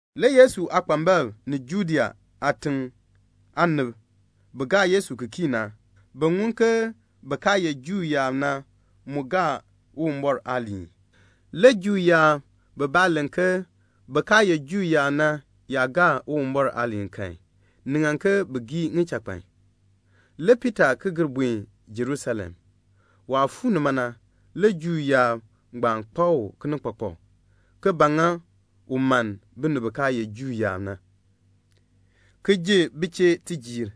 Le Yesu aakpambalb ni Judea aatiŋ aanib bi gaa Yesu ki kii na, bi ŋun ke bin kaa ye Juu yaab na mu gaa Uwumbɔr aaliin. Le Juu yaab bibaa len ke bin kaa ye Juu yaab na yaa gaa Uwumbɔr aaliin kan, ni ŋan ke bin gii ŋichakpan. Le Piita ki gir buen Jerusalem. Waah fuu nima na, le Juu yaab ngbaan kpak u kinikpakpak, ke ba ŋa u mann binib bi kaa ye Juu yaab na, ki ji bi chee tijiir,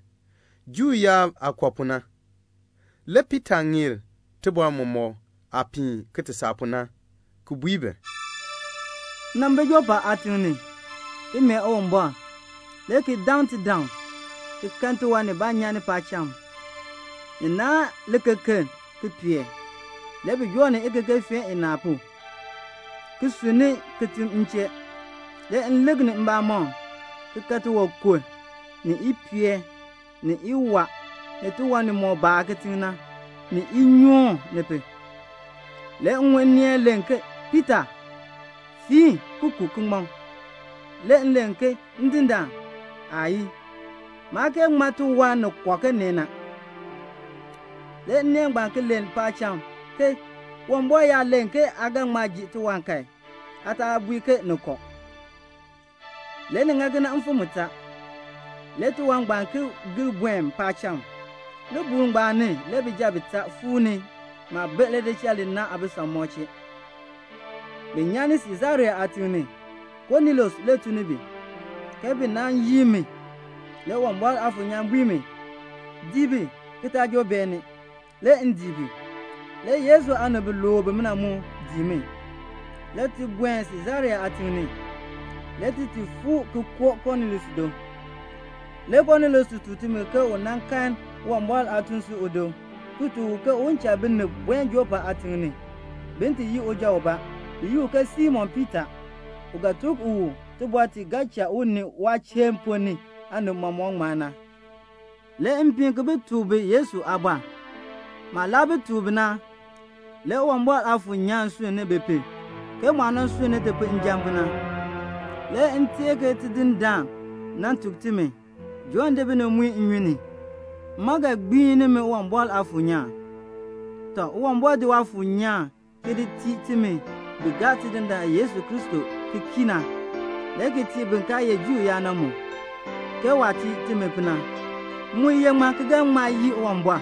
Juu yaab aah kɔ pu na. Le Piita ŋeer tibɔr mɔmɔk aah piin ki ti saa pu na, ki bui bi: "M nan bi Jɔpa aatiŋ ni, ki mee Uwumbɔr, le ki daŋ tidaŋ, ki kan tiwan nibaa nyan ni paacham. Ni naahn likekeln, ki pee. Le bi joo ikekefeen inaa pu, ki sunni kitiŋ m chee. Le m lik ni mbamɔm, ki kan tiwankur, ni ipeel, ni iwaa, ni tiwan nimɔk baar kitiŋ na, ni inyoon, ni pu. Le m ŋun nneel len ke, 'Piita, fiin ki ku ki ŋmɔ.' Le m len ke, 'Ndindaan, aayii. Maa kee ŋman tiwan ni kɔ na ke nee na.' Le nneel ngbaan ki len paacham ke, 'Uwumbɔr yaa len ke aa ga ŋma ji tiwan kan, aa taa bui ke ni kɔ.' Le ni ŋa kena mfim mutaa. Le tiwan ngbaan ki gir buen paacham. Libuul ngbaan ni le bijab bitaa fuu ni maah bi lidichal li ni na aabisamɔb chee. Bi nyan ni Siisarea aatiŋ ni. Konelius le tun ni bi, ke bi nan yin mi. Le Uwumbɔr Aafuur nyaan bui mi, 'Dii bi, ki taa joo beeni.' Le m dii bi. Le Yesu aanib biluub bimina mu dii mi, le ti buen Siisarea aatiŋ ni, le ti ti fuu ki koo Konelius do. Le Konelius tuk timi ke u nan kan Uwumbɔr aatuun si udo ki tuk u ke un cha binib buen Jɔpa aatiŋ ni, bin ti yin uja ubaa, bi yi u ke Simon Piita, u ga tuk u tibɔr ti ga cha u ni waachiln ponn ni aanib mɔmɔk ŋmar na. Le m piin ki bi tuk bi Yesu aabɔr. Maah laa tuk bi na, le Uwumbɔr Aafuur nyaan sunn ni bi pu, ke mu aah nan sunn ni ti pu njan pu na. Le m teer ke Tidindaan nan tuk timi, 'Jɔnn di binib ki muin bi nnyun ni. Mma ga gbiin nimi Uwumbɔr Aafuur nyaan.' Tɔ, Uwumbɔr di Waafuur nyaan ki di tii timi bi gaa Tidindaan Yesu Kristo ki kii na, le ki tii bin kaa ye Juu yaab na mu, ke waah tii timi pu na. M mu ye ŋmaa ki ga ŋma yii Uwumbɔr?"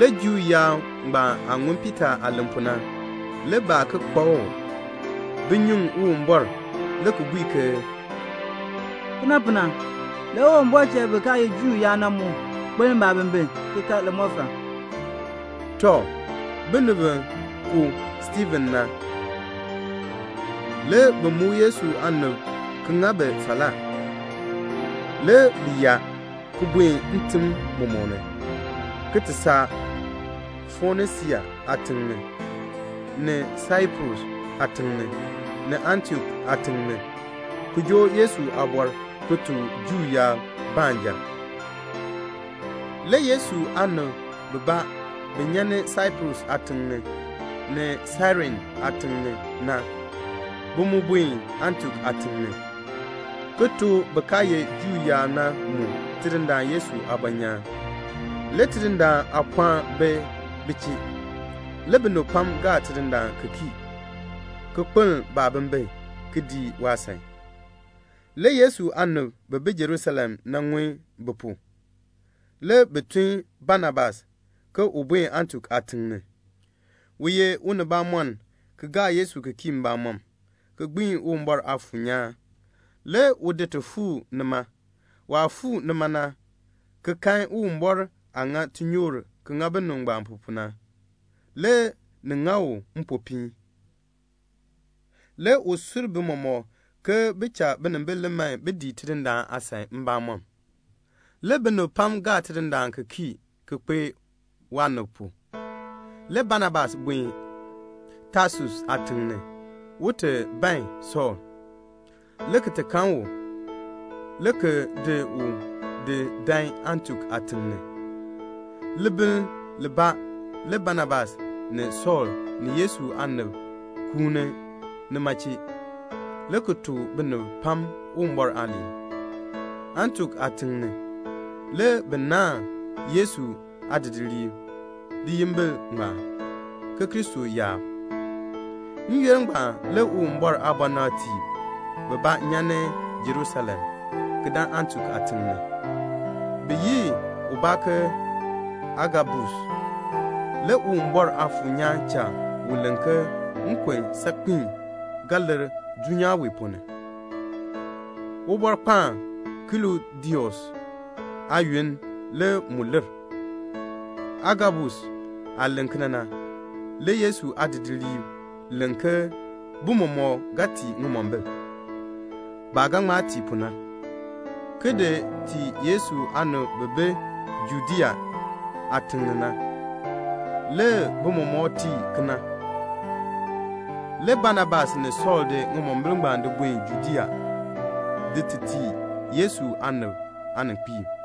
Le Juu yaab ngbaan aah ŋun Piita aah len pu na, le baa ki kpak u. Bi nyuŋ Uwumbɔr, le ki bui ke, "Kena pu na, le Uwumbɔr cha bin kaa ye Juu yaab na mu kpeln baabimbin ki kan limɔfal." Tɔ, binib bi ku Stiifen na, le bi muk Yesu aanib ki ŋa bi falaa. Le bi yaa ki buen ntim mɔmɔk ni, ki ti saa Fonisia aatiŋ ni, ni Saiprus aatiŋ ni, ni Antiok aatiŋ ni, ki joo Yesu aabɔr ki tuk Juu yaab baanja. Le Yesu aanib bibaa bi nyan ni Saiprus aatiŋ ni, ni Sairene aatiŋ ni na, bi mu buen Antiok aatiŋ ni, ki tuk bin kaa ye Juu yaab na mu Tidindaan Yesu aabɔnyaan. Le Tidindaan aapɔɔn bi bi chee. Le binib pam gaa Tidindaan ki kii, ki kpeln baabimbin, ki dii waasan. Le Yesu aanib bi bi Jerusalem na ŋun bi pu. Le bi tun Banabas ke un buen Antiok aatiŋ ni. U ye unibamɔnn, ki gaa Yesu ki kii mbamɔm, ki gbii Uwumbɔr Aafuur nyaan. Le u di ti fuu nima. Waah fuu nima na, ki kan Uwumbɔr aah ŋa tinyoor ki ŋa binib ngbaan pu na, le ni ŋa u mpopiin. Le u sur bi mɔmɔk ke bi cha binimbil li man bin dii Tidindaan aasan mbamɔm. Le binib pam gaa Tidindaan ki kii ki kpee waanib pu. Le Banabas buen Tasus aatiŋ ni, un ti ban Sɔɔl, le ki ti kan u, le ki di u ki di dan Antiok aatiŋ ni. Libiln libaa le Banabas ni Sɔɔl ni Yesu aanib kuuni nima chee; le bi tuk binib pam Uwumbɔr aaliin. Antiok aatiŋ ni, le bi naan Yesu aadidiliib liyimbil ngbaan, Kristo yaab. N-yoonn ngbaan le Uwumbɔr aabɔnabtiib bibaa nyan ni Jerusalem, ki dan Antiok aatiŋ ni. Bi yi ubaa ke Agabus. Le Uwumbɔr Aafuur nyaan cha u len ke nkon saakpiin ga lir dulnyaa wee ponn ni. (Ubɔrkpaan Klɔdius aayoonn le mu lir.) Agabus aah len kena na, le Yesu aadidiliib len ke bi mɔmɔk ga tii ŋimombil, baah ga ŋma tii pu na, ki di tii Yesu aanib bi bi Judea aatiŋ ni na. Le bi mɔmɔk tii kena. Le Banabas ni Sɔɔl di ŋimombil ngbaan di buen Judea, ti di tii Yesu aanib aaninkpiib.